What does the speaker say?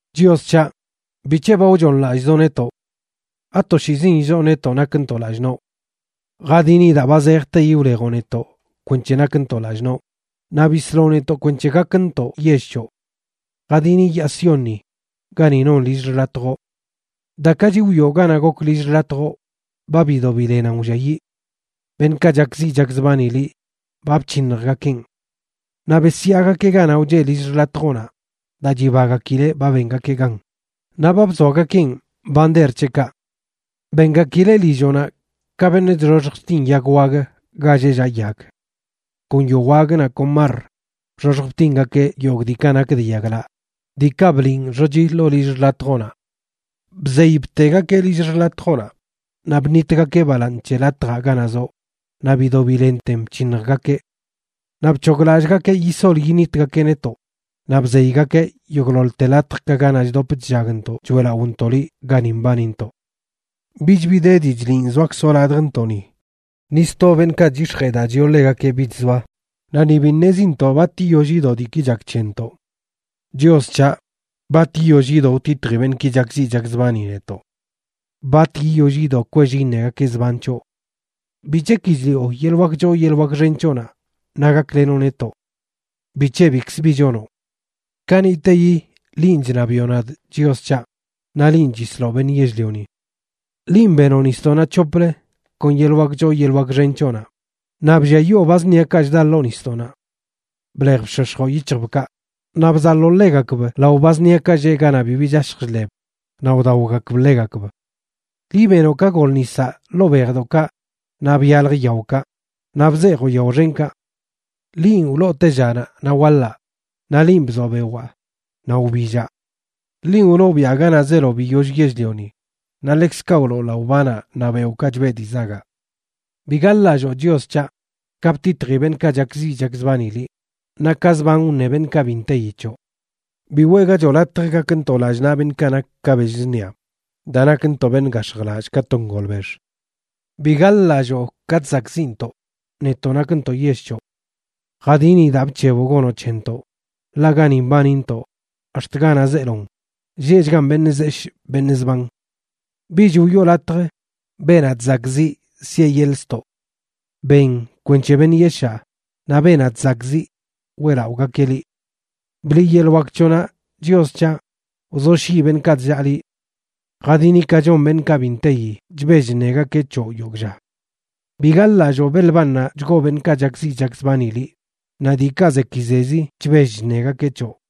Chios c̱haꞌ, ¿bic̱he ba wchooṉlallꞌzoꞌ netoꞌ? ¿Atoshiizin illoo netoꞌ nakntoꞌ lallꞌ noꞌ? Jadini daa ba zejteyi wlejoꞌ netoꞌ kwenc̱he nakntoꞌ lallꞌ noꞌ, naꞌ bisloꞌ netoꞌ kwenc̱he gakntoꞌ yell c̱hoꞌ. Jadini yaa Siónni gani non lill xḻatjoꞌ. Dakachi wiꞌo ganaꞌ gok lill xḻatjoꞌ, ba bido bilenan wlliayiꞌ. Beṉꞌkaꞌ chakziꞌ chakzbani liꞌ ba bc̱hiṉjgakeꞌn. Naꞌ besyaagakeꞌ ganaꞌ wcheꞌ lill xḻatjoꞌnaꞌ daa chibagakileꞌ ba bengakeꞌ gan, naꞌ ba bzoagakeꞌn bander c̱heꞌkaꞌ. Bengakileꞌ lilloꞌnaꞌ ka beṉꞌ chxoxj chtin yag wag ga lleꞌ llaꞌ yag. Kon yowag naꞌ kon marr bxoxj btingakeꞌ yogꞌ diikaꞌ nak de yaglaꞌ, diikaꞌ bliꞌn xochi ḻoo lill xḻatjoꞌnaꞌ. Bzey btegakeꞌ lill xḻatjoꞌnaꞌ, naꞌ bṉitgakeꞌ balaaṉ c̱he latjaꞌ ganaꞌ zoꞌ naꞌ bido bilenten bc̱hiṉjgakeꞌ. Naꞌ bc̱hoglallꞌgakeꞌ yisol yiṉitgakeꞌ netoꞌ; naꞌ bzeygakeꞌ yogꞌḻoḻte latjkaꞌ ganaꞌ chdop chllagntoꞌ choeꞌlaꞌontoꞌ liꞌ gani mbanintoꞌ. Bich bi de dii chliꞌn zoakzoꞌ ladjntoꞌni; ni sto beṉꞌkaꞌ chyix̱jee daa chiꞌo ḻegakeꞌ bich zoa, naꞌ ni bi ṉezintoꞌ bat yiyoll yido diiki chak c̱hentoꞌ. Chios c̱haꞌ, ¿bat yiyoll yido wtitji beṉꞌki chakziꞌ chakzbani netoꞌ? ¿Bat yiyoll yido kwell iṉegakeꞌ zban c̱hoꞌ? ¿Bic̱he ki chliꞌo yeḻꞌ wak choo yeḻꞌ wak xen c̱hoꞌnaꞌ naꞌ gaklenoꞌ netoꞌ? ¿Bic̱he bikz bi chonoꞌ? Kaniꞌteyi linꞌ chṉabiꞌo nadꞌ, Chios c̱haꞌ; naꞌ linꞌ chisloꞌ beṉꞌ yell-lioni. Linꞌ benoꞌ nisdoꞌnaꞌ c̱hoplə kon yeḻꞌ wak choo yeḻꞌ wak xen c̱hoꞌnaꞌ, naꞌ blliayoo ba zṉiakaꞌ chda ḻoo nisdoꞌnaꞌ. Blej bshoshjoꞌ yic̱hjbkaꞌ, naꞌ bzaḻoo ḻegakb lao ba zṉiakaꞌ lleꞌ ganaꞌ bibi chashj chḻeb naꞌ wdaogakb ḻegakb. Liꞌ benoꞌ ka gol nisaꞌ ḻoo bejdoꞌkaꞌ naꞌ byalj yaokaꞌ, naꞌ bzeejoꞌ yao xenkaꞌ. Linꞌ wloo tellanaꞌ naꞌ waḻaꞌ naꞌ linꞌ bzoꞌ bewaa naꞌ wbillaꞌ. Linꞌ wloo biaꞌ ganaꞌ zeelo biyoll yell-lioni naꞌ ḻekzkaꞌ wloo laꞌo banaꞌ naꞌ beoꞌkaꞌ chbeꞌ dii zagaꞌ. Bi gaḻ-lalloo, Chios c̱haꞌ, ka btitji beṉꞌkaꞌ chakziꞌ chakzbani liꞌ, naꞌ ka zban wṉe beṉꞌkaꞌ bi nteyi c̱hoꞌ. Bi weꞌgachoꞌ latj gakntoꞌ lallꞌ naꞌ beṉꞌkaꞌ nak ka bell zṉia, daa nakntoꞌ beṉꞌ gax̱jlallꞌ ka to ngolbex. ¡Bi gaḻ-lalloo ka chzakꞌziꞌntoꞌ, netoꞌ nakntoꞌ yell c̱hoꞌ! Jadini daa bc̱heboꞌ gonoꞌ c̱hentoꞌ, ḻaꞌ gani mbanintoꞌ, ax̱t ganaꞌ zeelon, lleꞌchgan beṉꞌ zeshꞌ beṉꞌ zban. Bich wiꞌo latj beenaꞌ chzakꞌziꞌ siꞌe yeḻꞌ ztoꞌ. Ben kwenc̱he beṉꞌ yeshaa naꞌ beenaꞌ chzakꞌziꞌ weꞌlaꞌogakeꞌ liꞌ. ¡Bliꞌ yeḻꞌ wak c̱hoꞌnaꞌ, Chios c̱haꞌ! Wzoshyiꞌ beṉꞌkaꞌ chllaa liꞌ. Jadini ka chon beṉꞌkaꞌ bi nteyi chbell chṉegakeꞌ c̱hoꞌ yogꞌ lla. Bi gaḻ-lalloo belbannaꞌ chgoo beṉꞌkaꞌ chakziꞌ chakzbani liꞌ, naꞌ diikaꞌ zekizezi chbell chṉegakeꞌ c̱hoꞌ.